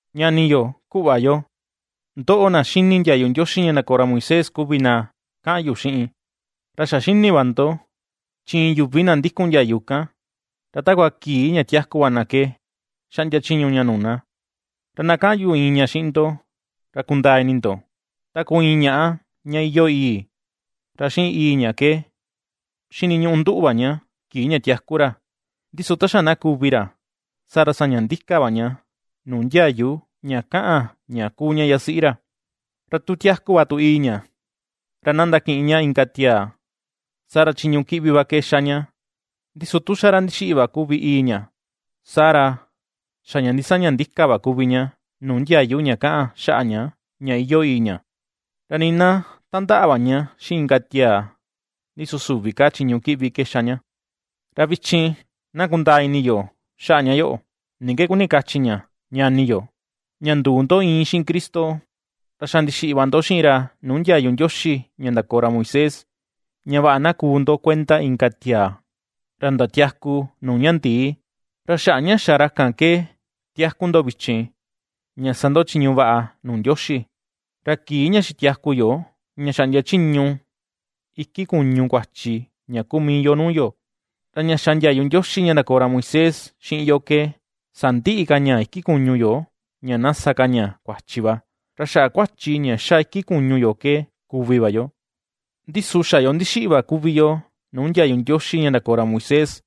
Ñani yo, kuꞌva yo, ndoꞌo na xini ndiayu Ndioxi ña ndakoo ra Moisés kuvi na kaꞌan yu xiꞌin. Ra xa xini va ndo, chi iin yuvi na ndikun ndiayu kan, ra takua kii ña tiaku va na ke xaꞌndia chiñu ña nuu na. Ra na kaꞌan yu iin ña xiꞌin ndo, ra kundaa ini ndo. Ta kuu iin ñaꞌá ña iyoo ìi̱ ra xiꞌin ìi̱ ña ke xiniñuꞌu nduꞌu va ña kii ña tiaku ra, ndi su ta xa na kuvi ra, saa ra saña ndika va ña nuu ndiayu ña kaꞌan ña kuu ña yasiꞌi ra. Ra tu tiaku va tu ìi̱ ña, ra na ^ndakiꞌin ña inka tiaa, saa ra chiñu kiꞌvi va ke ^xa ña, ndi su tu xa ra ndixiꞌi va kuvi ìi̱ ña, saa ra xa ña ndisaña ndika va kuvi ña nuu ndiayu ña kaꞌan xaꞌa ña, ña iyoo ìi̱ ña, ra nii na tandaꞌa va ña xiꞌin inka tiaa, ndi su süvi ka chiñu kiꞌvi ke ^xa ña. Ra vichin na kundaa ini yo xaꞌa ña yoꞌo, ni ke kuni kachi ña, ñani yo: ña nduu ndo iin xiꞌin Cristo, ra xa ndixiꞌi va ndo xiꞌin ra nuu ndiayu Ndioxi ña ndakoo ra Moisés; ña vaꞌa na kuu ndo kuenda inka tiaa, ra ndatiaku nuu ña ndii. Ra xaꞌa ña xa ra kan ke tiaku ndo vichin, ña sa ndo chiñu vaꞌa nuu Ndioxi. Ra kii ña xitiaku yo ña xaꞌndia chiñu iki kuñu kuachi ña kuu mii yo nuu yo, ra ña xa ndiayu Ndioxi ña ndakoo ra Moisés xiꞌin yo ke sandiꞌi ka ña iki kuñu yo ña na sa ka ña kuachi va, ra xaꞌa kuachi ña ^xa iki kuñu yo ke kuvi va yo. Ndi su xa yo ndixiꞌi va kuvi yoo nuu ndiayu Ndioxi ña ndakoo ra Moisés,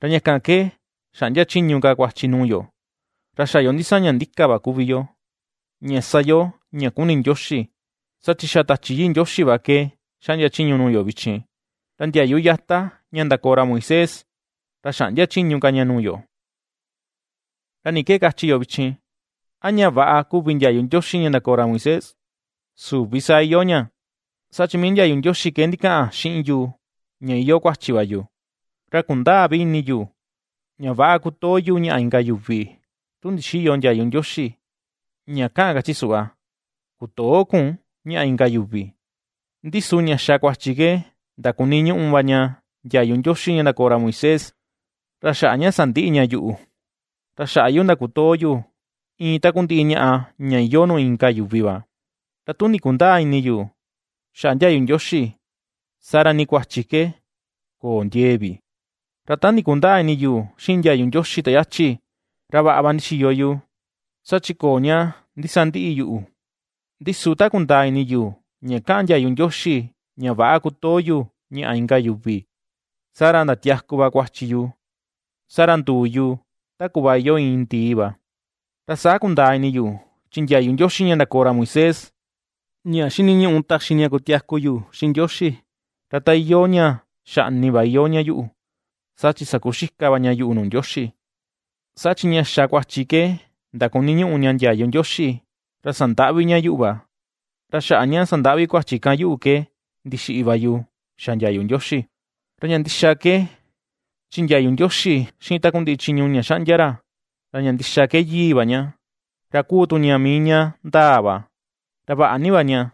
ra ña kan ke xäꞌndia chiñu ka kuachi nuu yo, ra xa yo ndisaña ndika va kuvi yo, ña ^sa yo ña kuni Ndioxi, saa chi xa Tachi Yii Ndioxi va ke xaꞌndia chiñu nuu yo vichin, ra ndiayu yata ña ndakoo ra Moisés, ra xäꞌndia chiñu ka ña nuu yo. ¿Ra ni ke kachi yo vichin? ¿a ña väꞌa kuvi ndiayu Ndioxi ña ndakoo ra Moisés? ¡Süvi saa iyoo ña! Saa chi mii ndiayu Ndioxi ke ndikaꞌan xiꞌin yu ña iyoo kuachi va yu. Ra ^kundäa vi ini yu ña väꞌa kutoo yu ñaꞌa inka yuvi, tu ndixïyo ndiayu Ndioxi, ña kaꞌan kachi suꞌva: “Kutöo kun ñaꞌa inka yuvi.” Ndi su ña xa kuachi ke ndakuniñuꞌu va ña ndiayu Ndioxi ña ndakoo ra Moisés, ra xaꞌa ña sandiꞌi ña yuꞌu, ra xaꞌa yu ndakutoo yu iin takundiꞌi ñaꞌa ña iyoo nuu inka yuvi va. Ra tu ndikundäa ini yu xaꞌa ndiayu Ndioxi, saa ra nii kuachi ke köo ndiee vi. Ra ta ndikundäa ini yu xiꞌin ndiayu Ndioxi ta yachi, ra vaꞌa va ndixiyo yu, saa chi köo ña ndisandiꞌi yuꞌu, ndi su ta kundaa ini yu ña kaꞌan ndiayu Ndioxi ña väꞌa kutoo yu ñaꞌa inka yuvi, saa ra ndatiaku va kuachi yu, saa ra nduu yu ta kuꞌva iyoo iin ndii va. Ra saa kundaa ini yu, chi ndiayu Ndioxi ña ndakoo ra Moisés, ña xiniñuꞌu taxi ña kutiaku yu xiꞌin Ndioxi, ra ta iyoo ña xaꞌni va iyoo ña yuꞌu, saa chi sakuxika va ña yuꞌu nuu Ndioxi. Saa chi ña xa kuachi ke ndakuniñuꞌu ña ndiayu Ndioxi, ra sandaꞌvi ña yuꞌu va; ra xaꞌa ña sandaꞌvi kuachi kan yuꞌu ke ndixiꞌi va yu xa ndiayu Ndioxi. Ra ña ndixa ke, chi ndiayu Ndioxi xiꞌin takundiꞌi chiñu ña xaꞌndia ra, ra ña ndixa ke Yii va ña, ra kuu tu ña mii ña ndaa va, ra vaꞌa ni va ña.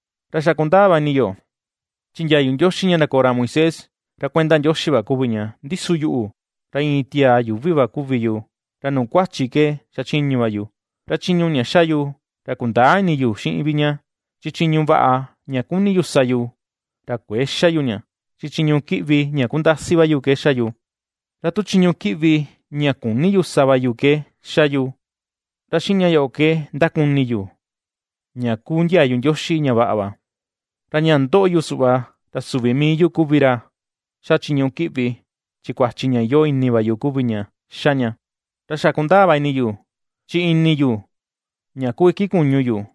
Ra xa kundaa va ini yo, chi ndiayu Ndioxi ña ndakoo ra Moisés, ra kuenda Ndioxi va kuvi ña, ndi su yuꞌu, ra iin tiaa yuuvi va kuvi yu, ra nuu kuachi ke xachiñu va yu. Ra chiñu ña ^xa yu, ra kundäa ini yu xiꞌin vi ña, chi chiñu vaꞌa ña kuni yu ^sa yu, ra kuëe xa yu ña, chi chiñu kiꞌvi ña kundasi va yu ke ^xa yu. Ra tu chiñu kiꞌvi ña küni yu sa va ke ^xa yu, ra xiꞌin ña yoꞌo ke ndakuni yu, ña kuu ndiayu Ndioxi ña vaꞌa va. Ra ña ^ndoꞌo yu suꞌva, ra süvi mii yu kuvi ra ^xa chiñu kiꞌvi, chi kuachi ña iyoo ini va yu kuvi ña ^xa ña. Ra xa kundaa va ini yu, chi ini yu, ña kuu iki kuñu yu,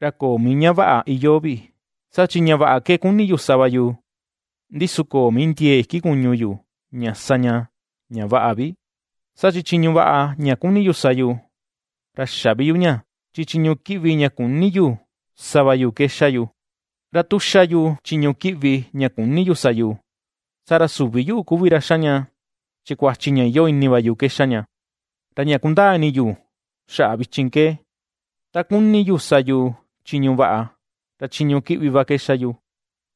ra köo mii ña vaꞌa iyoo vi, saa chi ña vaꞌa ke kuni yu sa va yu, ndi su köo mii ndiee iki kuñu yu, ña sa ña, ña vaꞌa vi. Saa chi chiñu vaꞌa ña kuni yu sa yu, ra xä vi yu ña, chi chiñu kiꞌvi ña küni yu sa va yu ke ^xa yu. Ra tu ^xa yu chiñu kiꞌvi ña küni yu sa yu, saa ra süvi yuꞌu kuvi ra ^xa ña, chi kuachi ña iyoo ini va yu ke ^xa ña. Ra ña kundaa ini yu xaꞌa vichin ke: ta kuni yu sa yu chiñu vaꞌa, ra chiñu kiꞌvi va ke xa yu.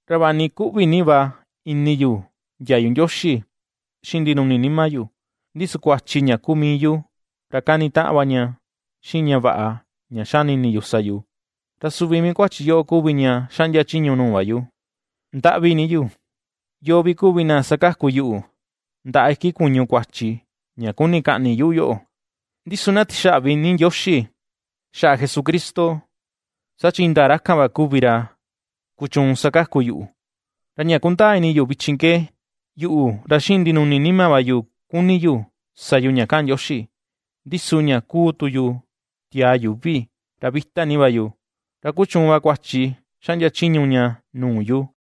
Ra vaꞌa ni kuꞌvi ni va ini yu ndiayu Ndioxi xiꞌin ndinuni nima yu, ndi su kuachi ña kuu mii yu, ra kanitaꞌan va ña xiꞌin ña vaꞌa ña xani ini yu sa yu; ra suvi mii kuachi yoꞌo kuvi ña xaꞌndia chiñu nuu va yu. ¡Ndaꞌvi ni yu! ¿Yoo vi kuvi na sakaku yuꞌu ndaꞌa iki kuñu kuachi ña kuni kaꞌni yuꞌu yoꞌo? Ndi su na tixaꞌvi ni Ndioxi, xaꞌa Jesucristo, saa chi indaa ra kan va kuvi ra kuchuun sakaku yuꞌu. Ra ña kundaa ini yu vichin ke, yuꞌu ra xiꞌin ndinuni nima va yu kuni yu sa yu ña kaꞌan ndiayu Ndioxi, ndi su ña ^kuu tu yu tiaa yuuvi, ra vita ni va yu, ra kuchuun va kuachi xaꞌndia chiñu ña nuu yu.